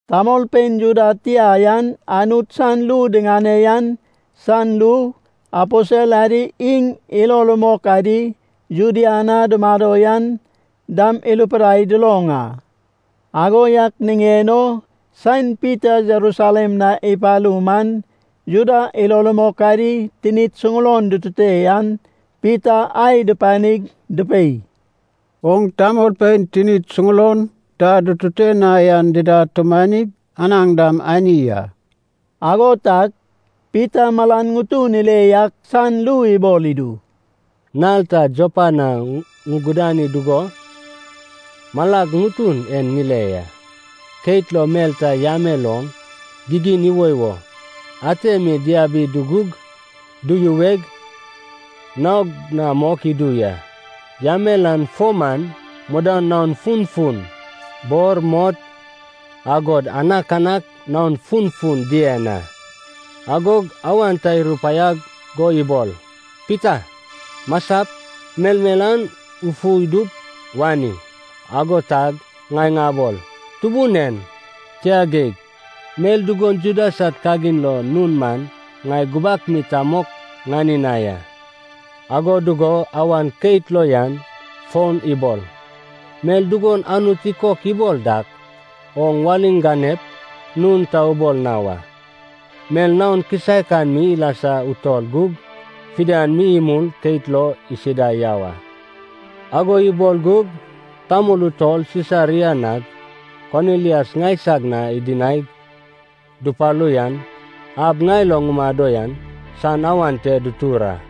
Tamolpein Juda tia yan Anut san ru diŋane yan san ru, aposel adi iŋ ilo rumok adi Judea na dumado yan dam irupidai duloŋ a. Ago yak niŋen o saen Pita Jerusalem na ipalu man, Juda ilo rumok adi tinid suŋulon dutute an Pita ai dupanig dupei, “Oŋ tamolpein tinid suŋulon ta dutute na yan dida atumanig, anaŋ dam ani a.” Ago tag Pita malan ŋutun ile yak san ru ibol idu, “Nal ta Jopa na ŋugudani dugo, malag ŋutun en ŋile ya. Keit lo mel ta yamel oŋ gigin iwoiwo ate mi diabi dugug, duyuweg, naog na mok idu ya. Yamel an fo man mudan naon funfun. Bor, mot, agod anakanak naon funfun dien a. Agog awan ta irupaiag go ibol, ‘Pita, masap, melmel an ufu idup wani.’” “Ago tag ŋai ŋabol, ‘Tubun en, tia geig. Mel dugon Juda sad kagin lo nun man ŋai gubak mi ta mok ŋani na ya.’” “Ago dugo awan keit lo yan fon ibol, ‘Mel dugon Anut ikok ibol dak, oŋ waliŋ ganep, nun ta ubol na wa.’ Mel naon kisaek an mi ilasa utol gug, fidian mi imul keit lo isida yau a.” “Ago ibol gug tamol utol Sisaria nag Konilias ŋaisag na idinaig dupalu yan ab ŋai lo ŋumado yan san awan te dutur a.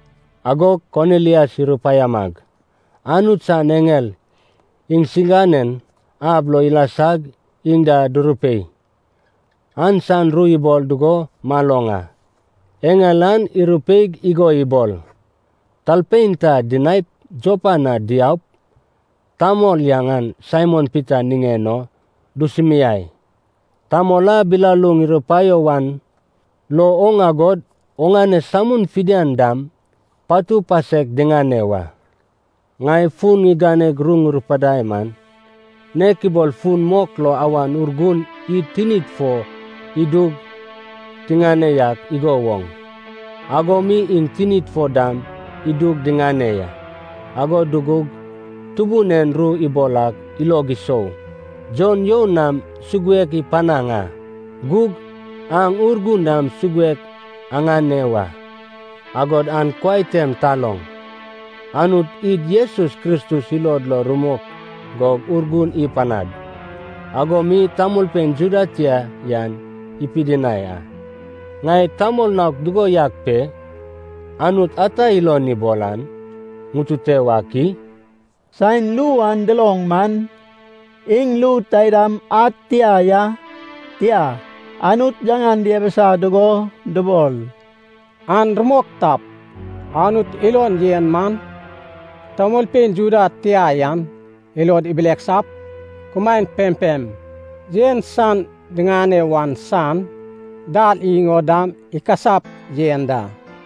Agog Konilias irupaiamag Anut san eŋel iŋsiganen ab lo ilasag iŋ da durupei an san ru ibol dugo maloŋ a. Eŋel an irupeig igo ibol, ‘Talpein ta dinaip Jopa na diaup, tamol yaŋan Saimon Pita niŋen o dusumiai. Tamol a bilaluŋ irupaio wan lo oŋ agod oŋane samun fidian dam patu pasek diŋane wa.’ “Ŋai fun ŋiganeg ru ŋurupidai man, nek ibol fun mok lo Awan Urgun id tinid fo idug tiŋane yak igo woŋ, ago mi iŋ tinid fo dam idug diŋane ya. Ago dugug Tubun en ru ibol ak ilog isou, ‘Jon you nam suguek ipanaŋ a, gug aŋ Urgun nam suguek aŋane wa.’ Agod an kuai tem taloŋ, Anut id Jesus Kristus ilod lo rumok go Urgun ipanad, ago mi tamolpein Juda tia yan ipidinai a. Ŋai tamol naok dugo yak pe, Anut ata ilon ibol an ŋutute wak i?” Saen ru an duloŋ man, iŋ ru taidam ad tia ya, tia, Anut yaŋan diabisa dugo dubol, “An rumok tap, Anut ilon yen man tamolpein Juda tia yan ilod ibileksap, kumaen pempem yen san diŋane wan san dal iŋ o dam ikasap yen da.”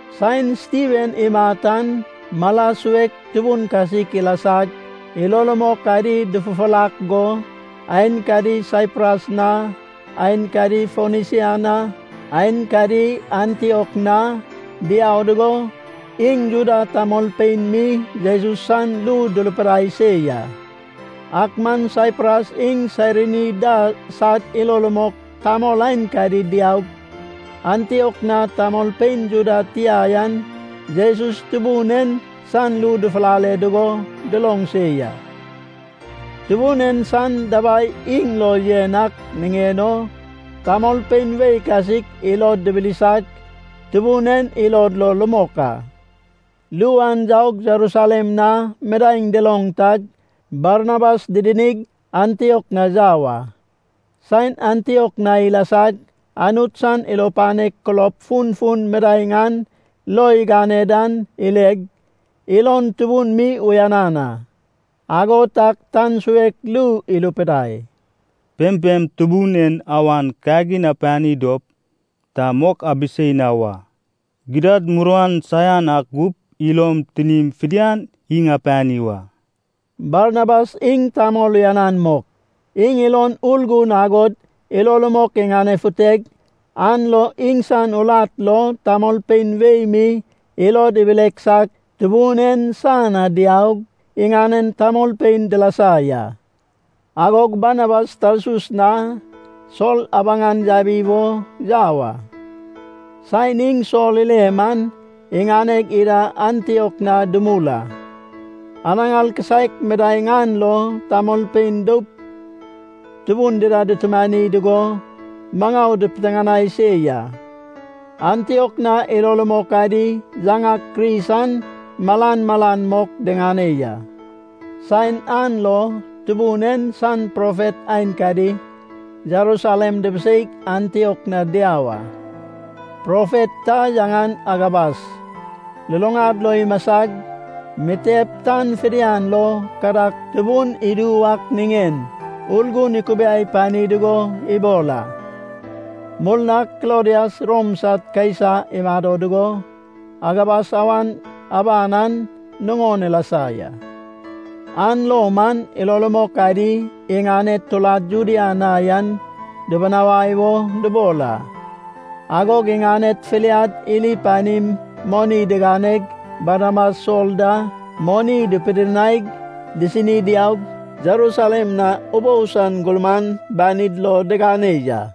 Saen Stiven imat an mala suek tubun kasik ilasag, ilo rumok adi dufufurak go aenkadi Saipras na, aenkadi Fonisia na, aenkadi Antiok na, diau dugo iŋ Juda tamolpein mi Jesus san ru durupidai se ya. Ak man Saipras iŋ Sairini da sad ilo rumok tamol aenkadi diaug, Antiok na tamolpein Juda tia yan Jesus Tubun en san ru dufulale dugo duloŋ se ya. Tubun en san dabai iŋ lo yen ak niŋen o tamolpein wei kasik ilod dibilisag, Tubun en ilod lo rumok a. Ru an yaug Jerusalem na midaeŋ duloŋ tag Barnabas didinig, Antiok na yau a. Saen Antiok na ilasag Anut san ilo panek kulob funfun midaeŋ an lo igane dan ileg, ilon tubun mi uyanan a. Ago tag tan suek ru irupidai, “Pempem Tubun en awan kagin apani dop, ta mok abisei na wa. Gidad, muruan saian ak gup ilom tinim fidian iŋ apani wa.” Barnabas iŋ tamol uyanan mok. Iŋ ilon Urgun agod ilo rumok iŋanefuteg an lo iŋsan urat lo tamolpein wei mi ilod ibileksag Tubun en san na diaug iŋanen tamolpein dilasa ya. Agog Barnabas Tarsus na Sol abaŋan yabi wo yau a. Saen iŋ Sol ile man, iŋaneg ida Antiok na dumul a. Anaŋar kisaek midaeŋ an lo tamolpein doup tubun dida dutumani dugo maŋau dipiteŋanai se ya. Antiok na ilo rumok adi yaŋak Kris an malmalan mok diŋane ya. Saen an lo Tubun en san profet aenkadi Jerusalem dibiseig Antiok na diau a. Profet ta yaŋan Agabas luluŋad lo imasag, mitep tan fidian lo kadag tubun idu wak niŋen Urgun ikubiai pani dugo ibol a. (Murnag Klodias Rom sad Kaisa imado dugo Agabas awan aban an nuŋon ilasa ya.) An lo man ilo rumok adi iŋaned turad Judea na yan dubunawai o dubol a. Agog iŋaned filiad iri panim moni diganeg Barnabas Sol da moni dupidinaig disini diaug Jerusalem na ubou san gurman banid lo digane ya.